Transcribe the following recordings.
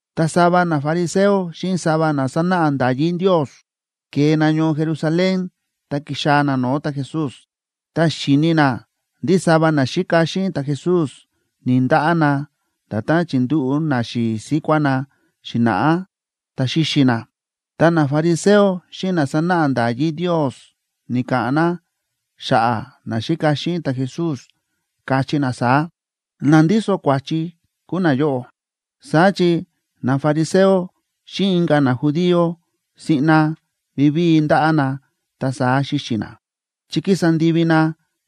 Ta sava nafariseo xíꞌin sava na sánáꞌa nda̱yí Ndios ke̱e na ñoo Jerusalén, ta ki̱xaa̱ na no̱o̱ ta̱Jesús. Ta xi̱ni na ndí sava naxíka xíꞌin ta̱Jesús ni̱‑ndaꞌá na nda̱tán chi̱ndúꞌu̱ naxi̱i̱ síkuá na xi̱na̱ꞌá, ta xi̱xi na. Ta nafariseo xíꞌin na sánáꞌa nda̱yí Ndios ni̱ka̱ꞌa̱n na xa̱ꞌa̱ naxíka xíꞌin ta̱Jesús, káchí na saá: ―Na ndíso kua̱chi kúu nayóꞌo. (Saá chi nafariseo xíꞌin inka̱ najudío siꞌna vivíi ndáꞌá na ta saá xíxi na, chi kísa ndivi na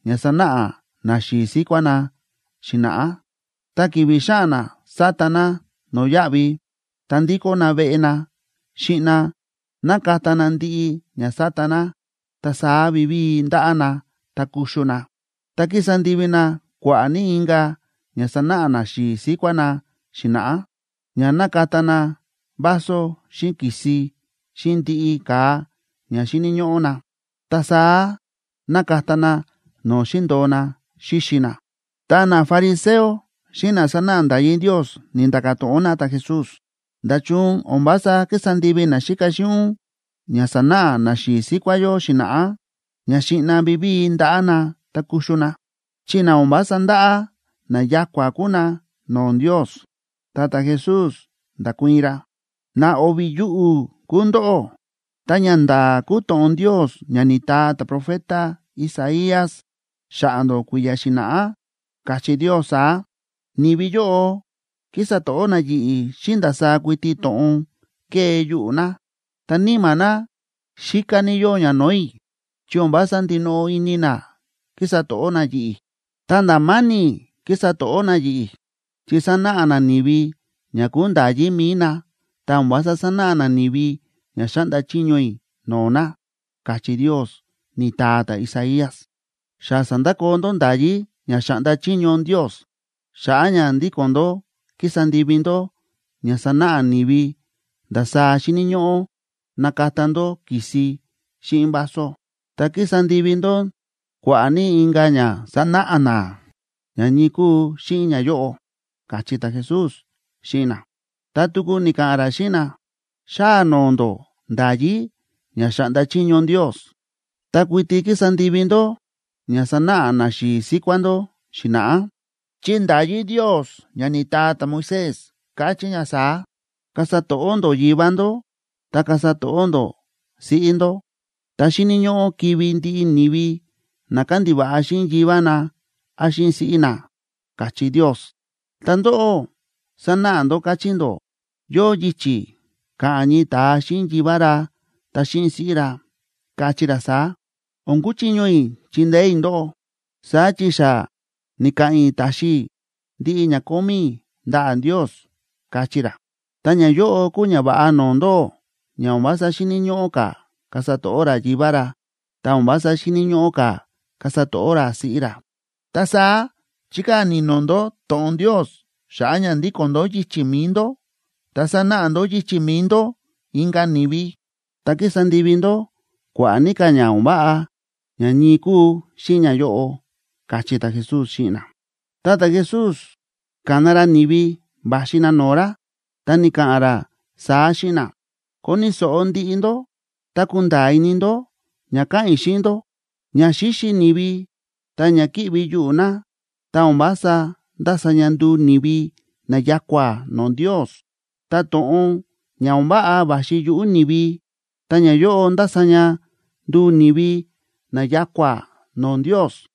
ña sa̱náꞌa naxi̱i̱ síkuá na xi̱na̱ꞌá. Tá ki̱vi̱ xáꞌa̱n na sata na no̱yáꞌvi, ta ndíkó na veꞌe na, siꞌna nákata na ndiꞌi ña sa̱ta na, ta saá vivíi ndáꞌá na ta kuxu na. Ta kísa ndivi na kua̱ꞌa̱ ní inka̱ ña sa̱náꞌa naxi̱i̱ síkuá na xi̱na̱ꞌá, ña nákata na vaso, xíꞌin ki̱si, xíꞌin ndiꞌi ka̱a ña xíni̱ ñóꞌó na, ta saá nákata na no̱o̱ xi̱ndo̱o na xíxi na.) Ta nafariseo xíꞌin na sánáꞌa nda̱yí Ndios ni̱nda̱ka̱ to̱ꞌon na ta̱Jesús: ―¿Nda̱chun o̱n vása kísa ndivi naxíka xíꞌin ún ña sa̱náꞌa naxi̱i̱ síkuá yó xi̱na̱ꞌá, ña siꞌna vivíi ndaꞌá na ta kuxu na?, chi na o̱n vása ndáꞌá, na ya̱kua̱ kúu na no̱o̱ Ndios. Ta ta̱Jesús nda̱kuii̱n ra: ―¡Na o̱vi̱ yuꞌu̱ kúu ndóꞌó! Ta ñanda̱a̱ kúu to̱ꞌon Ndios ña ni̱taa ta̱profeta Isaías xa̱ꞌa̱ ndó kui̱ya̱ xi̱na̱ꞌá, káchí Ndios saá: Ni̱vi yóꞌo kísa to̱ꞌó na yi̱ꞌi̱ xíꞌin ndasaá kuiti to̱ꞌon kée yuꞌu̱ na, ta níma̱ na xíká ní yóo ña no̱o̱ i̱, chi o̱n vása ndinoꞌo ini na kísa to̱ꞌó na yi̱ꞌi̱. Ta nda̱ ma̱ni̱ kísa to̱ꞌó na yi̱ꞌi̱, chi sánáꞌa na ni̱vi ña kúu nda̱yí mi̱i na, ta o̱n vása sánáꞌa na ni̱vi ña xáꞌnda chiño i̱ no̱o̱ na, káchí Ndios, ni̱taa ta̱Isaías. Xa sa̱ndakoo ndó nda̱yí ña xáꞌnda chiño Ndios, xa̱ꞌa̱ ña ndíko̱n ndó kísa ndivi ndó ña sánáꞌa ni̱vi ndasaá xíni̱ ñóꞌó nakata ndó ki̱si xíꞌin vaso. Ta kísa ndivi ndó kua̱ꞌa̱ ní inka̱ ña sánáꞌa na ña ñii kúu xíꞌin ñayóꞌo ―káchí ta̱Jesús xíꞌin na. Ta tuku ni̱ka̱ꞌa̱n ra xíꞌin na: ―Xáa noo ndó nda̱yí ña xáꞌnda chiño Ndios, ta kuiti kísa ndivi ndó ña sa̱náꞌa naxi̱i̱ síkuá ndó xi̱na̱ꞌá. Chi nda̱yí Ndios ña ni̱taa ta̱Moisés káchí ña saá: “Kasa to̱ꞌó ndó yivá ndó, ta kasa to̱ꞌó ndó siꞌí ndó”, ta “Xíni̱ ñóꞌó kivi̱ ndiꞌi ni̱vi na kándiva̱ꞌa xíꞌin yivá na án xíꞌin siꞌí na”, káchí Ndios. Ta ndóꞌó, sánáꞌa ndó káchí ndó yóo yichi̱ ka̱ꞌa̱n ñii ta̱a xíꞌin yivá ra ta xíꞌin siꞌí ra, kachí ra saá: “O̱n kúchiño i̱ chindeé i̱ ndóꞌó, saá chi xa ni̱ka̱ꞌa̱n i̱ taxi i̱ ndiꞌi ña kómí i̱ ndaꞌa̱ Ndios”, kachí ra. Ta ñayóꞌo kúu ñava̱ꞌa no̱o̱ ndóꞌó, ña o̱n vása xíni̱ ñóꞌó ka̱ kasa to̱ꞌó ra yivá ra, ta o̱n vása xíni̱ ñóꞌó ka̱ kasa to̱ꞌó ra siꞌí ra. Ta saá chíkaa̱ ni̱no̱ ndó to̱ꞌon Ndios xa̱ꞌa̱ ña ndíko̱n ndó yichi̱ mi̱i ndó, ta sánáꞌa ndó yichi̱ mi̱i ndó inka̱ ni̱vi. Ta kísa ndivi ndó kua̱ꞌa̱ ní ka̱ ña o̱n váꞌa ña ñii kúu xíꞌin ñayóꞌo ―káchí ta̱Jesús xíꞌin na. Ta ta̱Jesús ka̱na ra ni̱vi va̱xi na no̱o̱ ra, ta ni̱ka̱ꞌa̱n ra saá xíꞌin na: ―Koni̱ so̱ꞌo ndiꞌi ndó, ta kunda̱a̱ ini ndó ña ka̱ꞌa̱n i̱ xíꞌin ndó. Ña xíxi ni̱vi ta ña kíꞌvi yuꞌu̱ na, ta o̱n vása ndása ña nduu ni̱vi na ya̱kua̱ no̱o̱ Ndios. Ta to̱ꞌon ña o̱n váꞌa va̱xi yuꞌu̱ ni̱vi, ta ñayóꞌo ndása ña nduu ni̱vi na ya̱kua̱ no̱o̱ Ndios.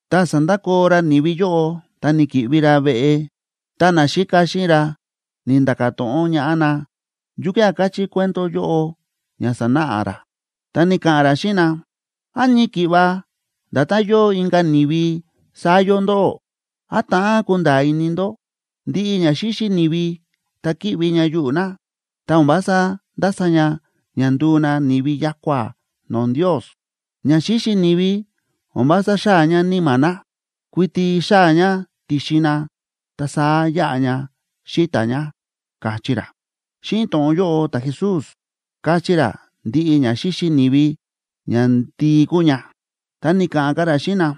Tá sa̱ndakoo ra ni̱vi yóꞌo, ta ni̱ki̱ꞌvi ra veꞌe, ta naxíka xíꞌin ra ni̱nda̱ka̱ to̱ꞌon ñaꞌá na yukía̱ káchí cuento yóꞌo ña sa̱náꞌa ra. Ta ni̱ka̱ꞌa̱n ra xíꞌin na: ―¿Án ñii ki̱ꞌva nda̱tán yóo inka̱ ni̱vi, saá yóo ndóꞌó? ¿Án ta̱ꞌán kunda̱a̱ ini ndó? Ndiꞌi ña xíxi ni̱vi ta kíꞌvi ña yuꞌu̱ na, ta o̱n vása ndása ña ña nduu na ni̱vi ya̱kua̱ no̱o̱ Ndios. Ña xíxi ni̱vi o̱n vása xáa̱ ña níma̱ na, kuiti xáa̱ ña ti̱xin na, ta saá yáꞌa ña xíta̱ ña ―káchí ra. Xíꞌin to̱ꞌon yóꞌo ta̱Jesús káchí ra ndiꞌi ña xíxi ni̱vi ñandii kúu ña. Ta ni̱ka̱ꞌa̱n ka̱ ra xíꞌin na: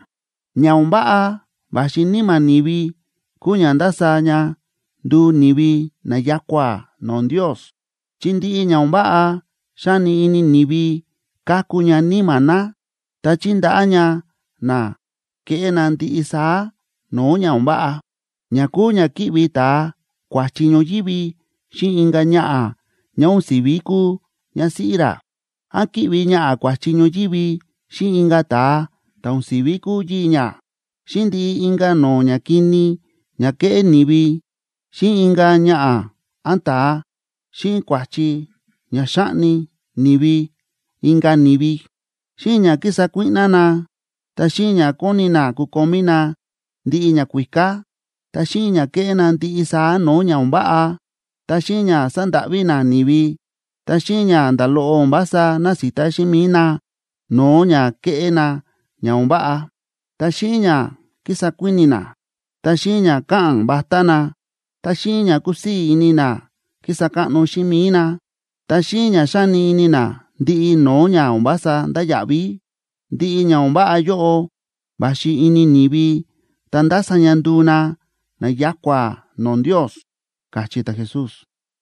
―Ña o̱n váꞌa va̱xi níma̱ ni̱vi kúu ña ndása ña nduu ni̱vi na ya̱kua̱ no̱o̱ Ndios. Chi ndiꞌi ña o̱n váꞌa xáni ini ni̱vi káku ña níma̱ na. Ta chíndaꞌá ña na keꞌé na ndiꞌi saá no̱o̱ ña o̱n váꞌa, ña kúu ña kíꞌvi ta̱a kua̱chi ñoyívi xíꞌin inka̱ ñaꞌa̱ ñá o̱n si̱ví kúu ñásíꞌí ra, án kíꞌvi ñaꞌa̱ kua̱chi ñoyívi xíꞌin inka̱ ta̱a ta̱ o̱n si̱ví kúu yii̱ ñá, xíꞌin ndiꞌi inka̱ no̱o̱ ñakini ña kéꞌé ni̱vi xíꞌin inka̱ ñaꞌa̱ án ta̱a, xíꞌin kua̱chi ña xáꞌni ni̱vi inka̱ ni̱vi, xíꞌin ña kísa kuíꞌná na, ta xíꞌin ña kóni na kukomí na ndiꞌi ñakuíká, ta xíꞌin ña kéꞌé na ndiꞌi saá no̱o̱ ña o̱n váꞌa, ta xíꞌin ña sándáꞌví na ni̱vi, ta xíꞌin ña nda̱ loꞌo o̱n vása násita xíꞌin mi̱i na no̱o̱ ña kéꞌé na ña o̱n váꞌa, ta xíꞌin ña kísa kuíni̱ na, ta xíꞌin ña káꞌa̱n vatá na, ta xíꞌin ña kúsii̱ ini na kísa káꞌno xíꞌin mi̱i na, ta xíꞌin ña xáni ini na ndiꞌi no̱o̱ ña o̱n vása ndáya̱ꞌví. Ndiꞌi ña o̱n váꞌa yóꞌo va̱xi ini ni̱vi ta ndása ña nduu na na ya̱kua̱ no̱o̱ Ndios ―káchí ta̱Jesús.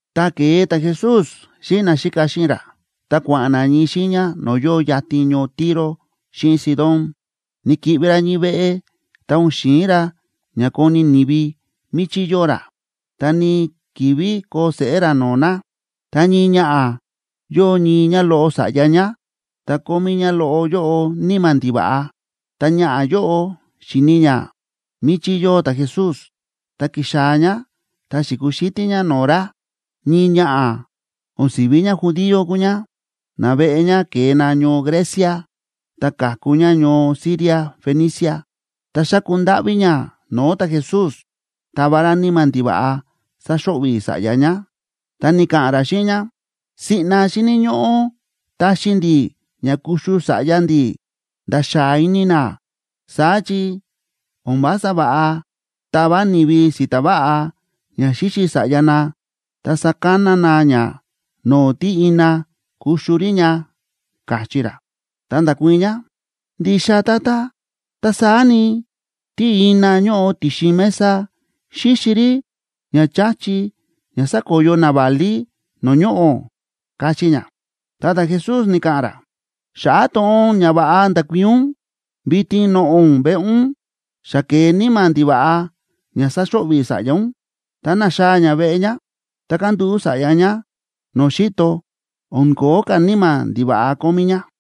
Ta ke̱e ta̱Jesús xíꞌin naxíka xíꞌin ra, ta kua̱ꞌa̱n na ñii xiiña no̱o̱ yóo yatin ñoo Tiro xíꞌin Sidón. Ni̱ki̱ꞌvi ra ñii veꞌe, ta o̱n xi̱in ra ña koni̱ ni̱vi míchí yóo ra, ta ni̱‑kivi koo seꞌé ra no̱o̱ na. Ta ñii ñaꞌa̱, yóo ñii ñáloꞌo sa̱ꞌya ñá, ta kómí ñáloꞌo yóꞌo níma̱ ndiva̱ꞌa. Tá ñaꞌa̱ yóꞌo xi̱ni̱ ñá míchí yóo ta̱Jesús, ta ki̱xaa̱ ñá ta xi̱kuxítí ñá no̱o̱ ra. Ñii ñaꞌa̱ o̱n si̱ví ñájudía kúu ñá, naveꞌe ñá ke̱e na ñoo Grecia, ta ka̱ku ñá ñoo Siria Fenicia. Ta xáku ndáꞌví ñá no̱o̱ ta̱Jesús tava ra níma̱ ndiva̱ꞌa sáxo̱ꞌvi̱ sa̱ꞌya ñá. Ta ni̱ka̱ꞌa̱n ra xíꞌin ñá: ―Siꞌna xíni̱ ñóꞌó taxi ndi̱ ña kuxu sa̱ꞌya ndi̱ nda̱ xáa ini na, saá chi o̱n vása va̱ꞌa tava ni̱vi si̱ta̱ váꞌa ña xíxi sa̱ꞌya na, ta sakana na ña no̱o̱ tí ina kuxu rí ña ―káchí ra. Ta nda̱kuii̱n ñá: ―Ndixa, Tata. Ta saá ni, tí ina ñóꞌo ti̱xin mesa xíxi rí ña cha̱chi ña sákoyo naválí no̱o̱ ñoꞌo̱ ―káchí ñá. Ta ta̱Jesús ni̱ka̱ꞌa̱n ra: ―Xa̱ꞌa̱ to̱ꞌon ñava̱ꞌa nda̱kuii̱n ún, vitin noꞌo̱ ún veꞌe ún, xa ke̱e níma̱ ndiva̱ꞌa ña sa̱xo̱ꞌvi̱ sa̱ꞌya ún. Ta na̱xaa̱ ñá veꞌe ñá, ta kándúꞌu̱ sa̱ꞌya ñá no̱o̱ xi̱to, o̱n ko̱ó ka̱ níma̱ ndiva̱ꞌa kómí ñá.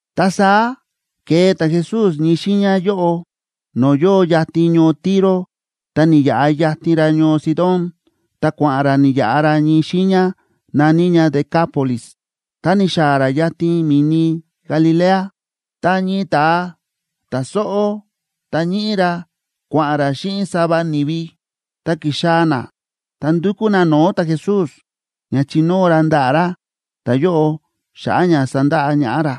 Ta saá ke̱e ta̱Jesús ñii xiiña yóꞌo no̱o̱ yóo yatin ñoo Tiro ta ni̱yaꞌa yatin ra ñoo Sidón, ta kua̱ꞌa̱n ra ni̱yaꞌa ra ñii xiiña na̱ní ña Decápolis, ta ni̱xaa̱ ra yatin mi̱ni Galilea. Ta ñii ta̱a ta̱ sóꞌó ta ñíꞌí ra kua̱ꞌa̱n ra xíꞌin sava ni̱vi, ta ki̱xaa̱ na ta ndu̱kú na no̱o̱ ta̱Jesús ña chinóo ra ndaꞌa̱ ra ta̱yóꞌo xa̱ꞌa̱ ña sandaꞌa ñaꞌá ra.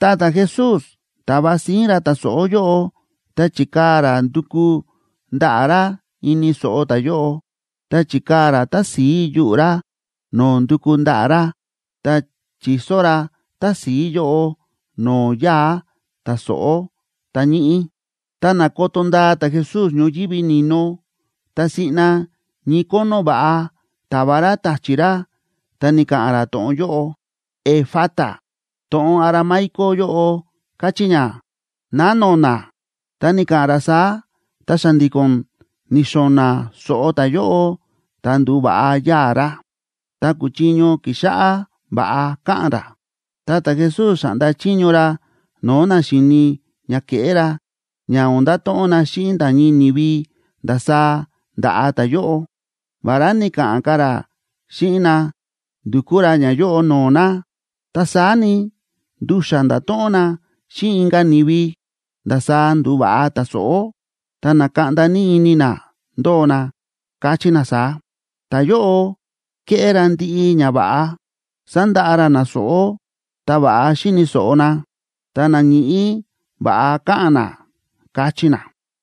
Ta ta̱Jesús ta̱va síín ra ta̱ sóꞌó yóꞌo, ta chi̱kaa̱ ra nduku ndaꞌa̱ ra ini so̱ꞌo ta̱yóꞌo. Ta chi̱kaa̱ ra tási̱i yuꞌu̱ ra no̱o̱ nduku ndaꞌa̱ ra ta chi̱so ra tási̱i yóꞌo no̱o̱ yáa̱ ta̱ sóꞌó ta̱ ñíꞌí. Ta na̱koto ndaa ta̱Jesús ñoyívi ni̱no, ta siꞌna ñii kónó va̱ꞌa ta̱va ra ta̱chi̱ ra, ta ni̱ka̱ꞌa̱n ra to̱ꞌon yóꞌo: ―¡Efata! To̱ꞌon aramaico yóꞌo káchí ña: ¡Ná no̱na̱! Ta ni̱ka̱ꞌa̱n ra saá, ta xa̱ndi̱ko̱n ni̱xo̱na̱ so̱ꞌo ta̱yóꞌo, ta ndu̱va̱ꞌa yáa̱ ra, ta kúchiño kixáꞌá va̱ꞌa káꞌa̱n ra. Ta ta̱Jesús xa̱ꞌnda chiño ra no̱o̱ na xi̱ni ña ke̱ꞌé ra, ña o̱n ndato̱ꞌon na xíꞌin nda̱ ñii ni̱vi ndasaá nda̱ꞌa ta̱yóꞌo. Vará ni̱ka̱ꞌa̱n ka̱ ra xíꞌin na ndukú ra ñayóꞌo no̱o̱ na, ta saá ni, ndu̱xa̱ nda̱to̱ꞌon na xíꞌin inka̱ ni̱vi ndasaá ndu̱va̱ꞌa ta̱ sóꞌó. Ta na̱kaꞌnda ní ini na ndóo na, káchí na saá: ―Ta̱yóꞌo kéꞌé ra ndiꞌi ñava̱ꞌa. Sándaꞌa ra na sóꞌó ta va̱ꞌa xíni̱ so̱ꞌo na, ta na ñíꞌí va̱ꞌa káꞌa̱n na ―káchí na.